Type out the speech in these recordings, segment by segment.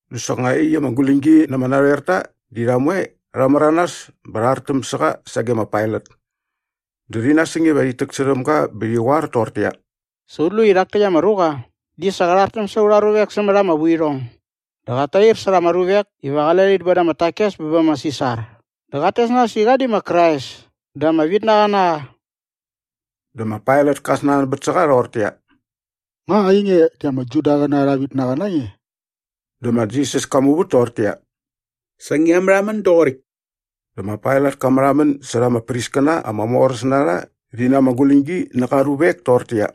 Dä soknga iaqyäkt ama guläñgi na ama narhoerta di rha moe rha märanas bä rha artäm sä qa sage ma Pailat. Dä rhi nasäng iva rhit täksärhäm ga bä rhi qoar toqortäqyia, “Sa ut lu i rhak täkt ama ruqa di sa qä rhartäm sa aurha ruvek sämät ama vuirhong. Dä qat tair särha ama ruvek iva qale rhit boda ama takes bä bä ma Sisar dä qat tes nas i qa di ma Krais dä ama vitnaqa na qa.” Dä ma Pailat ka snanbät sä qa rhoqortäqyia, “Nga ainge di ama Judaqäna arha vitnaqa na nge?” Dä ma Jisas ka muvät toqortäqyia, “Sa ngia märhamän doqoräkt.” Dä ma Pailat ka märhamän särha ama priskäna ama moräs na rha rhi na ama guläñgi nä qa ruvek toqortäqyia,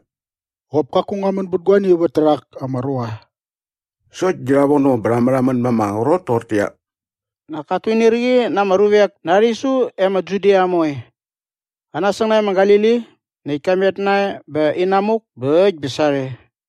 “Qop kaku ngua män bät guani vät tärhak ama ruqa.” Sokt di rha vono bä rha märhamän ma ama qrot toqortäqyia, “Nak kat tuinirqi na ama ruvek na aa rhisu e ma Judia moe. Qa nasäng nae ma Galili näkt ka met nae bä inamuk bä äkt bä sarhe.”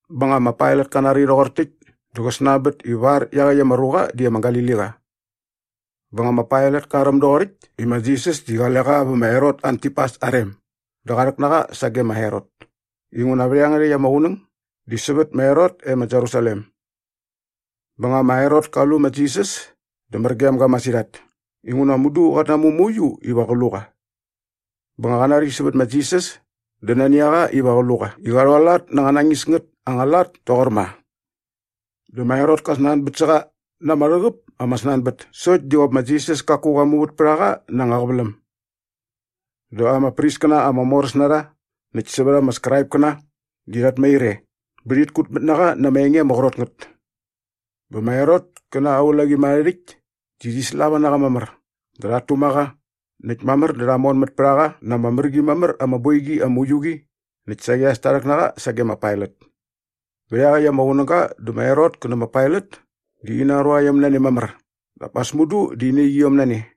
Bä nga ma Pailat ka nari rhoqor täkt dä qä snanbät ivar iaqäkt ama ruqa di ama Galiliqa. Bä nga ma Pailat ka räm doqoräkt i ma Jisas di qale qa vä ma Herot Antipas aa rem dä qa rhäk na qa sage ma Herot inguna vät iangärhäkt ama qunäng di sävät ma Herot e ma Jerusalem. Bä nga ma Herot ka lu ma Jisas dä mär gem ga masirhat inguna mudu qat namu mauiu iva qä lu qa. Bä nga qa nari sävät ma Jisas dä nani a qa iva qä lu qa i qa rhualat na anga nañis ngät ama lat toqor ma. Dä ma Herot ka snanbät sä qa na ama rhäqäp ama snanbät sokt di qop ma Jisas kaku qa muvät pät a qa na anga qäväläm. Dä ama priskäna ama moräs na rha näkt sävät ama Skraipkäna di rhat mair e bä rhit kutmät na qa na ama enge ama qrot ngät. Bä ma Herot kä na aa ulaqimärharhärhäkt di rhi slava na qa mamär dä rhat tuma qa näkt mamär dä rha monmät pät a qa na ama mär qi mamär ama boiqi ama uiu qi näkt saqi sa rha rhäk na qa sage ma Pailat. Vät iaqäkt ama qunäga dä ma Herot kä nä ma Pailat di ina ruaiom na ne mamär dap as mudu di ina iqiom na ne.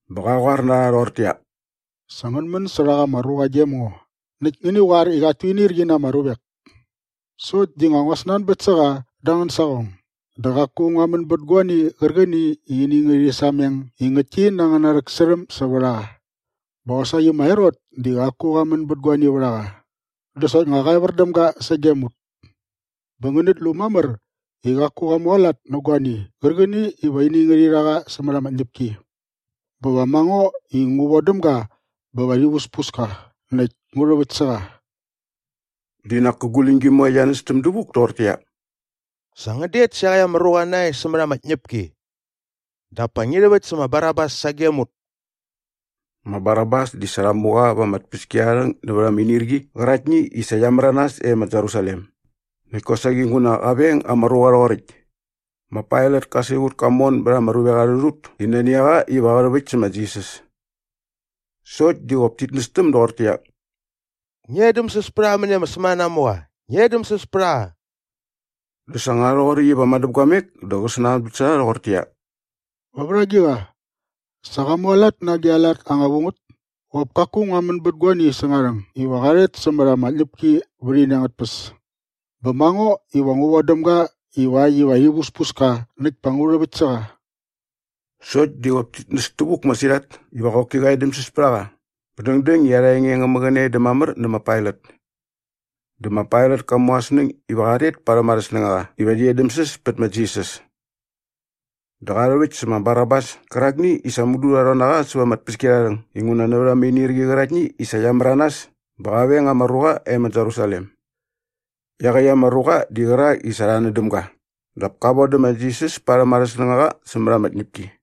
bä qa qoar na rha rhoqortäqyia, “Sa ngän män sä rhak ama ruqa gem ngo näkt ngäni qoar i qat tuinirqi na ama ruvek. Sokt di nga ngua snanbät sä qa da angän saqong dä qaku ngua män bät guani qärqäni i ini ngärhi sameng i ngäktki na angäna rhäksärhäm sävät a qa. Bä qosaqi ma Herot di qaku qa män bät guani vät a qa dä soknga qa evär däm ga sagem ut. Bä ngänät lu mamär i qaku qa mualat nä guani qärqäni iva ini ngärhi rha qa sämät ama tñäpki. Bä va ma ngo i ngu vodäm ga bä va rhi vuspus ka näkt ngu rhäväkt sä qa.” Di nak kä guläñgi moe qia nästäm dävuk toqortäqyia, “Sa ngän det sä iaqäkt ama ruqa nae sämät ama tñäpki. Dap pa ngi rhäväkt sä ma Barabas sagem ut!” Ma Barabas di sa rha mu qa va ama tpäskiarharhäng nävät ama inirqi qäraktni i sa qia märanas e ma Jerusalem näkt kosaqi nguna qa veng ama ruqa rhoqoräkt. Ma Pailat ka siqut ka mon bät ama ruvek arhä rhut i nani a qa iva qä rhäväkt sä ma Jisas. Sokt di qop tit nästäm doqortäqyia, “Ngi edämsäs pät a qa mäni ama sämänanamuqa! Ngi edämsäs pät a qa!” Näkt sa nga rhoqoräkt iva madäpguamek dä qä snanbät sä rha rhoqortäqyia, “Va vät agiqa? Sa qa mualat na agi a lat anga vu ngät? Qop kaku ngua män bät guani säng aa rhäng iva qa rhet sämät ama tñäpki vät ini angät tpäs. Bä ma ngo iva ngu vodäm ga ivakt iva rhi vuspus ka näkt pa ngu rhäväkt sä qa.” Sokt di qop tit näs tävuk masirhat iva qoki qä edämsäs pät a qa bä dängdäng i arha enge ngä mäqäne dä mamär nä ma Pailat. Dä ma Pailat ka mu aa snäng iva qa rhet parhäm arhä snängaqa iva rhi edämsäs pät ma Jisas. Dä qa rhäväkt sä ma Barabas kärakni i sa mudu rha rhon na qa säva ama tpäskiarharhäng inguna nävät ama inirqi qäraktni i sa qia märanas bä qa veng ama ruqa e ma Jerusalem. Iaqäkt ama ruqa di qärak i sa rha nän däm ga dap ka vodä ma Jisas parhäm arhä snängaqa sämät ama tñäpki.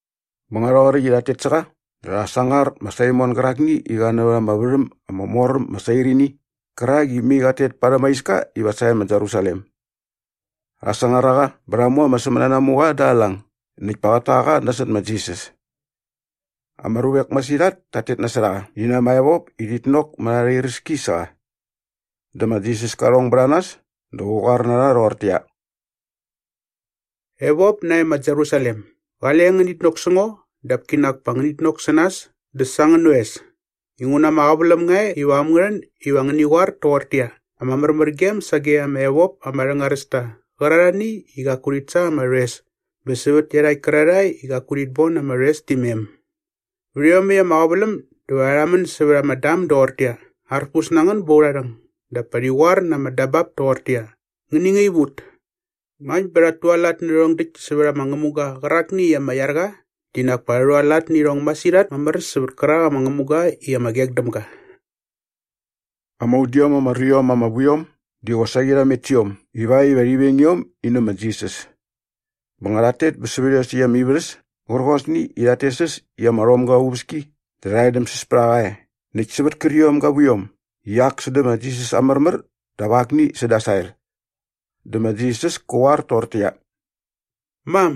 Bä nga rhoqoräkt i rhat tet sä qa dä rha sangar ma Saimon gärakni i qa näva ama värhäm ama mor äm ma Sairini qärak i mai qat tet parhäm aa iska iva sae ma Jerusalem. Rha sangar a qa bä rha mu ama sämänanamuqa da aa lang näkt pa qät ta qa nasot ma Jisas. Ama ruvek masirhat tat tet nasot a qa rhi na ama evop i rhit nok mät arha iräski sä qa. Dä ma Jisas ka rhong bät a nas dä qä qoar na rha rhoqortäqyia, “Evop nae ma Jerusalem, gale ngänit nok sä ngo dap kinak pa ngänit nok sä nas dä sa angän oes. Inguna ama qäväläm nga e iva äm ngä rhän iva ngäni qoar toqortäqyia, ‘Ama märmärgem sage ama evop ama rhängaräs ta qärarhani i qaku rhit sa ama rhoes bä sävät iarhakt kärarhae i qaku rhit bon ama rhoes ti mem!’ Vät iomäkt ama qäväläm dä va rha rhamän sävät ama dam doqortäqyia, ‘Arpus na ngän bät urha rhäng’ dap pa rhi qoar na ama dabap toqortäqyia, ‘Ngäni ngaip ut!’ Ngakt bä rhat tualat nä rhärhong däkt sävät ama ngämuga qärakni i ama iar qa di nak pa rha rhualat nä irhong masirhat mamär sävät kärak ama ngämuga i ama qek däm ga.” Ama udiom ama ruiom ama vu iom di qosaqi rha met sä iom ivakt iva rhi veng iom in nä ma Jisas. Bä nga rhat tet bä sävät iosäkt ama ivärhäs kärqosni i rhat tes äs i ama rhomga aa uväski dä rha edämsäs pät a qa e näkt sävät kärqiom ga vuiom i ak sädä ma Jisas aa märmär dap akni säda aa sael. Dä ma Jisas kä qoar toqortäqyia, “Mam,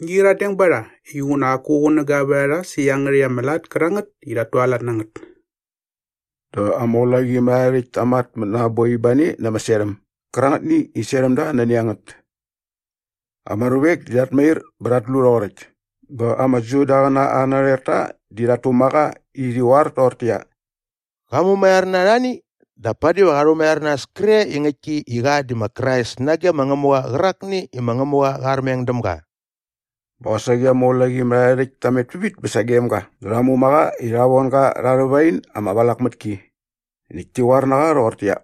ngi qyiradeng ba rha inguna qaku qunäga vät a rha sä iangärhäkt ama lat kärangät i rhat tualat na ngät.” Dä ama ulaqimärharhärhäkt ta matmät na aa boi ba ne na ama serhäm gärangätni i serhäm da nani a ngät. Ama ruvek di rhat mair bä rhat lu rhoqoräkt bä ama Judaqäna arhä narhoerta di rhat tuma qa. Dä rhi qoar toqortäqyia, “Qa mumaiar na arhani dap padi va qa rhumaiar nas kre i ngäktki i qa di ma Krais nage ma Ngämuqa qärakni i ma Ngämuqa qa armeng däm ga.” Bä qosaqi ama ulaqimärharhärhäkt ta met pävit bä sagem ga dä rha muma qa i rha von ga rha arhä wain ama valak mät ki näkt ti qoar na qa rhoqortäqyia,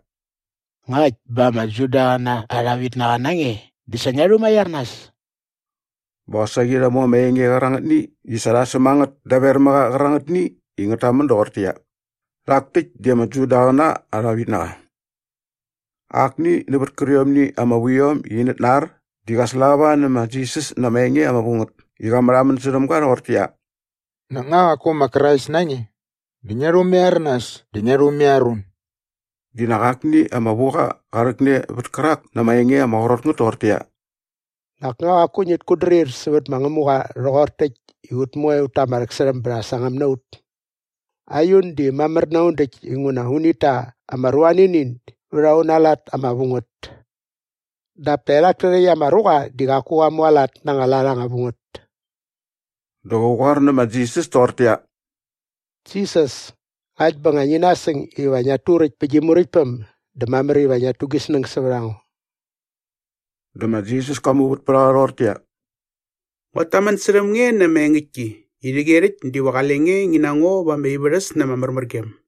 “Ngakt bä ama Judaqäna arha vitnaqa na nge dä sa ngia rhumaiar nas.” Bä qosaqi rha mu ama enge qärangätni i sa rha säm a ngät daver mä qa qärangätni i ngät tamän doqortäqyia, “Rhak täkt di ama Judaqäna arha vitnaqa.” Akni nävät kärqiomni ama vuiom i inät nar di qa slava nä ma Jisas na ama enge ama vu ngät i qa märhamän särhäm ga rhoqortäqyia, “Nak nga qaku ma Krais na nge? Dä ngia rhumaiar nas dä ngia rhumaiar un!” Di nak akni ama vuqa qa rhäkne vät kärak na ama enge ama qrot ngät toqortäqyia, “Nak nga qaku ngit kutdrir sävät ma Ngämuqa rhoqor täkt i ut moe ut ta ama rhäksärhäm bä rha sangäm na ut? Aiun di mamär na un däkt inguna unit ta ama ruanini vät auna lat ama vu ngät. Dap taerhak täkt ama ruqa di qaku qa mualat na anga lat anga vu ngät.” Dä qä qoar nä ma Jisas toqortäqyia, “Jisas, ngakt bä nga ngi nasäng iva ngiat turäkt pä gi muräktpäm dä mamär iva ngia rhu gi snäng sävät a ngo.” Dä ma Jisas ka muvät pät a qa rhoqortäqyia, “Nguat tamän särhäm nge na ama engäktki i rhäqyerhäkt diva qale nge ngi na ngo va ama ivärhäs na ama märmärgem.”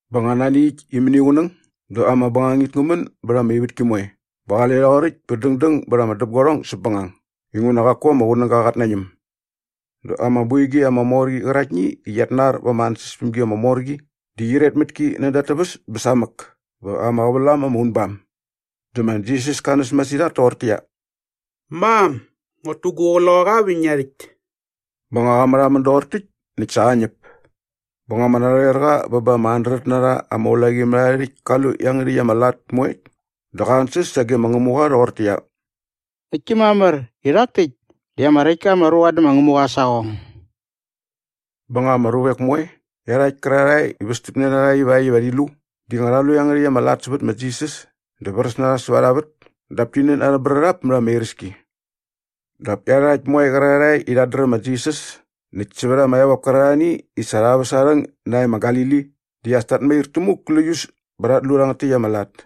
Bä nga nani äkt i mäniqunäng dä ama bängangit ngä män bät ama ivätki moe bä qale rhoqoräkt bä dängdäng bät ama däpguarhong säpbängang inguna qaku ama qunäga qat nañäm. Dä ama boiqi ama mor qi qäraktni i qiat nar va ama ansäspämgi ama mor qi di qyiret mät ki näda at täväs bä samäk bä ama qävälam ama unbam. Dä ma Jisas ka näs masirhat toqortäqyia, “Mam, nguat tu gu qloqaqa vä ngia rhäkt.” Bä nga qa märhamän doqor täkt näkt sa qa ñäp. Bä nga ama narhoerqa bä ba ama handret na rha ama ulaqimärharhärhäkt ka lu iangärhäkt ama lat moekt dä qa ansäs sage ma Ngämuqa rhoqortäqyia, “Ngäktki mamär i rhak täkt di ama räkt ka ama ruqa dä ma Ngämuqa aa saqong.” Bä nga ama ruvek moe iarhakt kärarhae i västämne na rha ivakt iva rhi lu di nga rha lu iangärhäkt ama lat sävät ma Jisas dä vräs na rha säva arha vät dap ti nän arhä brärhap mät ama iräski. Dap iarhakt moe qärarhae i rhat dräm ma Jisas näkt sävät ama evop kärarhani i sa rha väs aa rhäng nae ma Galili di as tat mair tämuk gläius bä rhat lu rhangät täkt ama lat.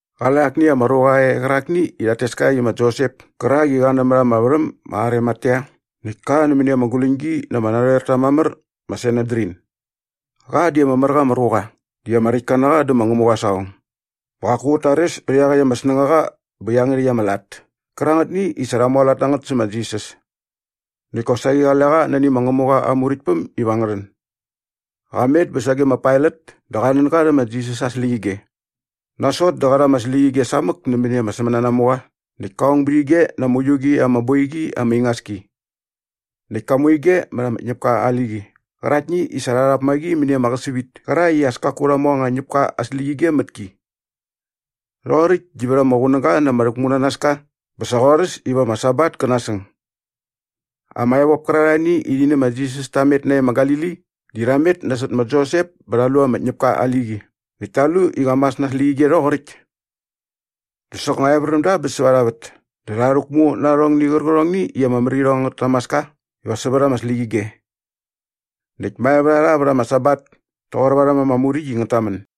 Qale akni ama ruqa e qärakni i rhat tes ka i ma Josep kärak i qa nämät ama värhäm ma Arimatea näkt ka nämäni ama guläñgi na ama narhoerta mamär ma Sanedrin. Qa di ama mär qa ama ruqa dä ama räktka na qa dä ma Ngämuqa aa saqong bä qaku qät tares pät iaqäkt ama snängaqa bä iangärhäkt ama lat kärangätni i sa rha mualat na ngät sä ma Jisas. Näkt kosaqi qale qa nani ma Ngämuqa aa Muräktpäm iva ngä rhän. Qa met bä sage ma Pailat dä qa nän ga rhä ma Jisas aa släqyige. Nasot dä qa rha ama släqyige samäk nämäni ama sämänanamuqa näkt ka ong bät ige na ama uiu qi ama boiqi ama ingas ki. Näkt ka mu ige mät ama ñäpka aa liqi qäraktni i sa rha rhap ma qi mäni ama qäsävit kärakt i as kaku rha mu anga ñäpka aa släqyige mät ki. Rhoqoräkt di vät ama qunäga na ama rhäkmunanaska bä sa qorhäs iva ama Sabat kä nasäng. Ama evop kärarhani i rhi nä ma Jisas ta met nae ma Galili di rha met nasot ma Josep bä rha lu ama ñäpka aa liqi näkt ta lu i qa mas na ama släqyige rhoqoräkt. Dä soknga evär däm da bä säva arha vät dä rha rhäkmu na arhong gärqärhongni i ama mär irhong angät tamaska iva sävät ama släqyige. Näkt mae vät a rha vät ama Sabat toqor varhäm ama Muräkt i ngät tamän.